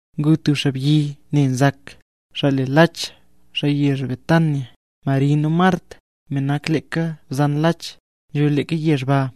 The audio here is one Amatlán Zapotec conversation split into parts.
Ngu tub xaabyi ne nzak, xaa le Lach, xaa yezh Betania. Mari nu Mart, me nak leeka bzan Lach, nzho leeka yezh ba.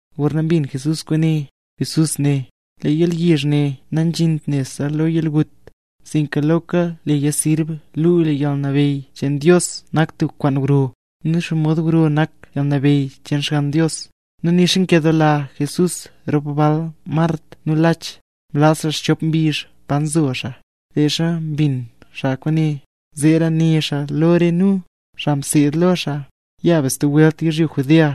Gorna mbin Jesús kwaane, nu né xaa: —Lee yalyizh ne nazhint nebse lo yalgut, sinka noka leya sirb luu lee yalnabeyy cheen Dios nak tub kwaan gro, nu xomod gro nak yalnabeyy cheen Xgann Dios. Nu nixa nkedoola Jesús rop bal Mart nu Lach, mlaz xaa xchop mbizh pa nzo xaa, leezha mbin xaa kwaane. Zeera né xaa lo re nu, xaa mseed lo xaa: —Ya be stub welt yizhyo Judea.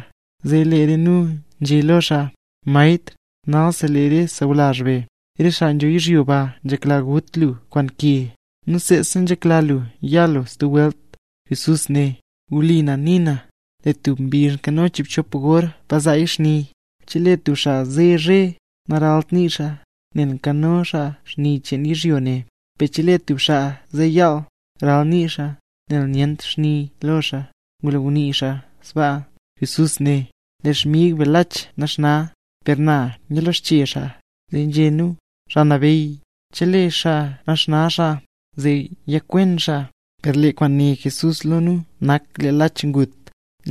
Zee lee re nu nzhé lo xaa: —Maestr, nalsi lee re sawlazh be, re xaa nzho yizhyo ba nzhekla ngut lu kwaan ke, nu seesa nzhekla lu ya lu baa stub welt. Jesús né: —Wli na nii na, lee tub mbizh nkano chiibchop gor pa nzaaya xni. Chelee tub xaa ze zhe, naralt nii xaa, nel nkano xaa xni cheen yizhyo ne; per chelee tub xaa ze yaal, nral nii xaa, nel nyent xni lo xaa. Ngulo ngunii xaa sbaa noka né xaa: —Lee xmig be Lach naxna, per na yalexche xaa. Zee nzhé nu: —Xaa Nabeyy, chelee xaa naxna xaa, zee yakwen xaa. Per lee kwaan né Jesús lo nu, nak lee Lach ngut,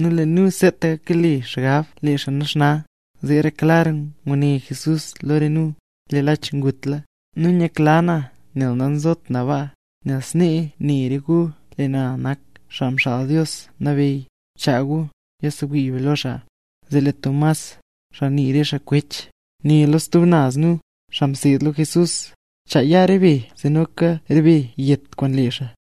nu lee nu seetaka kale xgab lee xaa naxna. Zeera klar nguné Jesús lo re nu: —Lee Lach ngutla. Nu nyakla na nel namzot na baa, nel snee ne re gu lee na nak Xaa Mxaal Dios Nabeyy. Chaa gu, yasewii be lo xaa. Zee lee Max, xaa nii re xaa “Kwech”, né lo stub naz nu, xaa mseed lo Jesús: —Chaa ya re be zee noka re be yet kwaan lee xaa.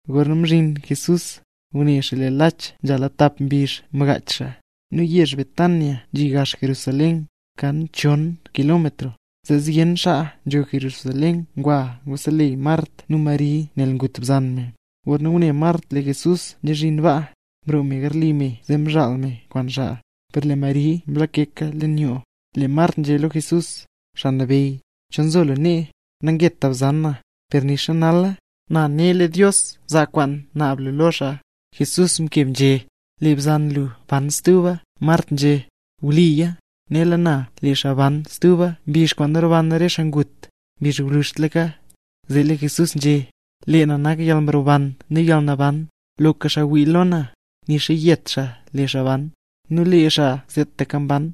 Gorna mzhin Jesús, ngune xaa lee Lach nzhala tap mbizh mkaach xaa. Nu yezh Betania nzhi gax Jerusalén, kan chon kilómetro, zee zyen xaa nzho Jerusalén ngwa nguseleyy Mart nu Mari nel ngut bzan me. Gorna ngune Mart lee Jesús mzezhin baa, mroo me garli me zee mzhaal me kwaan lee xaa; per lee Mari mlakeka leen yoo. Lee Mart nzhé lo Jesús: —Me Nabeyy, chol nzo lu nee, nangeta bzan na. Per nixa nala, na ne lee Dios zaa kwaan naab lu lo xaa. Jesús mkeb nzhé: —Lee bzan lu ban stuba. Mart nzhé: —Wliya, nela na, lee xaa ban stub mbizh kwaan roban re xaa ngut, mbizh gwluzhtlaka. Zee lee Jesús nzhé: —Lee na nak yalmroban nu yalnaban. Loka xaa wii lo na, nixa yet xaa lee xaa ban; nu lee xaa seetaka mban,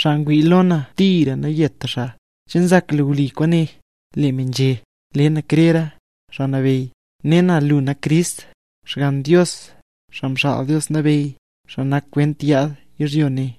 xaa ngwii lo na tira nayeta xaa. ¿Che nzak lu wli kwaane? Lee me nzhé: —Nle na krera, Me Nabeyy. Ne na lu nak Crist, Xgann Dios, Me Mxaal Dios Nabeyy, me nak kwent yaad yizhyo ne.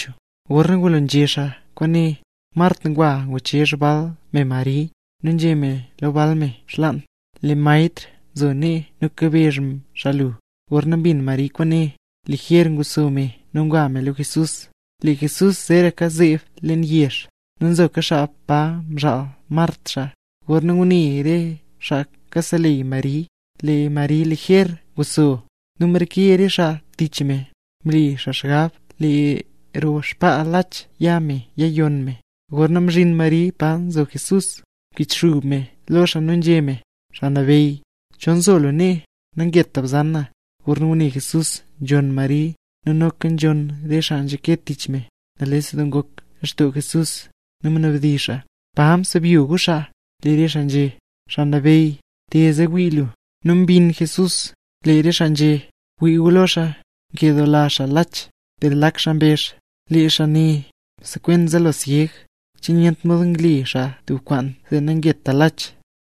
Gorna ngulo nzhé xaa kwaane, Mart ngwa nguchezh bal me Mari, nu nzhé meya lo bal me xlaan: —Lee Maestr nzo nee nu kabezh me lu. Gorna mbin Mari kwaane, lijer nguxso me nu ngwa me lo Jesús. Lee Jesús zeeraka zeeb leen yezh; nu nzoka xaa pa mzhaal Mart xaa. Gorna ngune re xaa kaseleyy Mari, lee Mari lijer nguxso, nu mreke re xaa tich me, mle xaa xgab lee roo xbaa Lach ya me yayonn me. Gorna mzhin Mari pa nzo Jesús, mkichxub me lo xaa nu nzhé me: —Me Nabeyy, chol nzo lu nee, nangeta bzan na. Gorna ngune Jesús nzhonn Mari, nu noka nzhonn re xaa nzhake tich me, nales doo ngok lextoo Jesús, nu mnabdizh xaa: —¿Pa msebyo gu xaa? Lee re xaa nzhé: —Xaa Nabeyy, te, zee wii lu. —¡Wii gu lo xaa, nkedoola xaa Lach! Per lak xaa mbezh: —Lee xaa ne msekwen zaalo syeg, ¿che nyent mod ngle xaa tub kwaan zee nangeta Lach?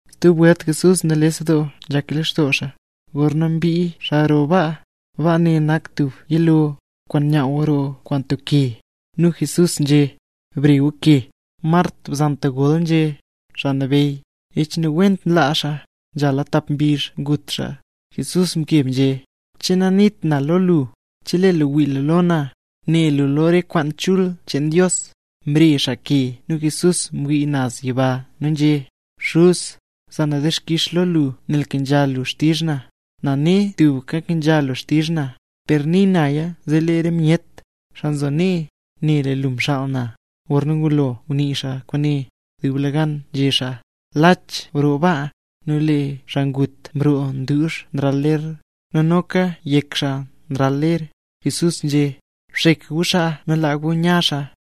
Stub welt Jesús nales doo nzhak lextoo xaa, gorna mbii xaa roo baa. Baa ne nak tub yiloo, kwaan nyaaw roo kwaan tub ke. Nu Jesús nzhé: —Bre gu ke. Mart bzan ntagol nzhé: —Me Nabeyy, ech nawent nlaa me, nzhala tap mbizh ngut me. Jesús mkeb nzhé: —¿Che nanit na lo lu, chelee lu wii lu lo na, ne lu lo re kwaan chul cheen Dios? Mre xaa ke, nu Jesús mwii naz yiba nu nzhé: —Xuz, za na dixkix lo lu nel mkenzha lu xtizh na. Na ne tubka nkenzha lu xtizh na; per nii naya zee lee re myet, xaa nzo nee, ne lee lu mxaal na. Gorna ngulo ngunii xaa kwaane, dublegan nzhé xaa: —¡Lach broo baa! Nu lee xaa ngut mroo nduuzh nral ler, nu noka yek xaa nral ler. Jesús nzhé: —Bxek gu xaa nu laa gu nya xaa.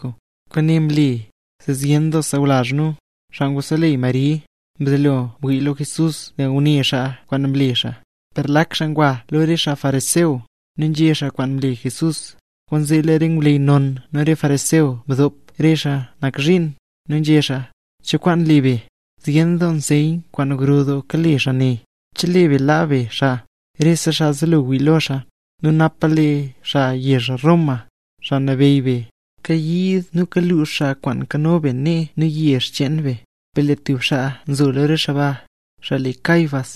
Kwaane mle, zee zyen sawlazh nu, xaa nguseleyy Mari, mzelo ngwii lo Jesús nel ngune xaa kwaan mle xaa. Per lak xaa ngwa lo re xaa fariseo, nu nzhé xaa kwaan mle Jesús. Kwaanzee lee re ngwleyy non nu re fariseo mdop re xaa nak zhiin, nu nzhé xaa: —¿Cho kwaan le be? Zyen doo nseyn kwaan gro doo kale xaa ne. Chelee be laa be xaa, rese xaa zelo wii lo xaa, nu napa lee xaa yezh Roma, xaa nabeyy be, kayiid nu kalux xaa kwaan nkano be nee nu yezh cheen be. Per lee tub xaa nzo lo re xaa ba, xaa le Caifás,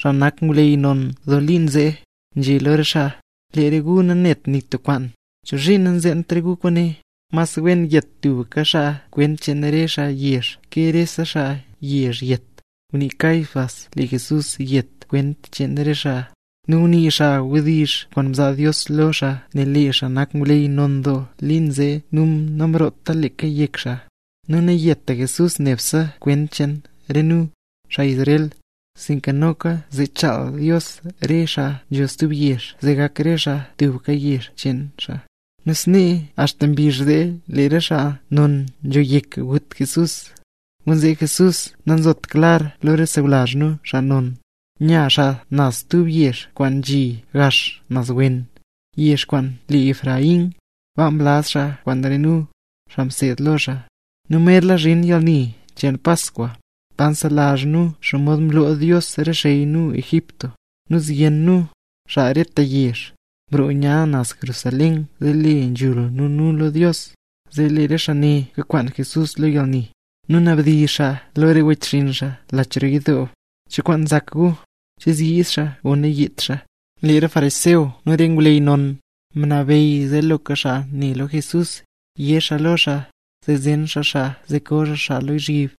xaa nak ngwleyy non doo liin zee, nzhé lo re xaa: —¡Re gu nanet nik tub kwaan! ¿Chozhiin nanzeent re gu kwaane? ¡Mas wen yet tubka xaa kwent cheen re xaa yezh, ke rese xaa yezh yet! Ngunii Caifás lee Jesús yet kwent cheen re xaa, nu ngunii xaa wdizh kwaan mzaa Dios lo xaa, nel lee xaa nak ngwleyy non doo liin zee nu namroota leeka yek xaa. Nu nayeta Jesús nebse kwent cheen re nu, xaa Israel, sinka noka zee chaal Dios re xaa nzho stub yezh zee gak re xaa tubka yezh cheen xaa. Nu snee axta mbizh zee lee re xaa non nzho yek gut Jesús. Kwaanzee, Jesús nanzotra klar lo re sawlazh nu, xaa non, nya xaa naz tub yezh kwaan nzhi gax naz wen, yezh kwaan le Efraín. Baa mlaz xaa kwaan re nu, xaa mseed lo xaa. Nu merla zhin yalni cheen Paskwa, pa nselazh nu xomod mloo Dios re xey nu Egipto, nu zyen nu, xaa rete yezh, nroo nzha naz Jerusalén zee le nzhul nu nu lo Dios. Zee re xaa ne kakwaan Jesús lo yalni, nu nabdizh re xaa lo wechxinn xaa lach roo yidoo: —¿Cho kwaan nzak gu? ¿Che zyiid xaa o nayiidt xaa? Lee re fariseo nu re ngwleyy non, mnabeyy zee loka xaa ne lo Jesús, yé xaaya lo xaa, zee zen xaa xaa zee ko xaa xaa lozhyib.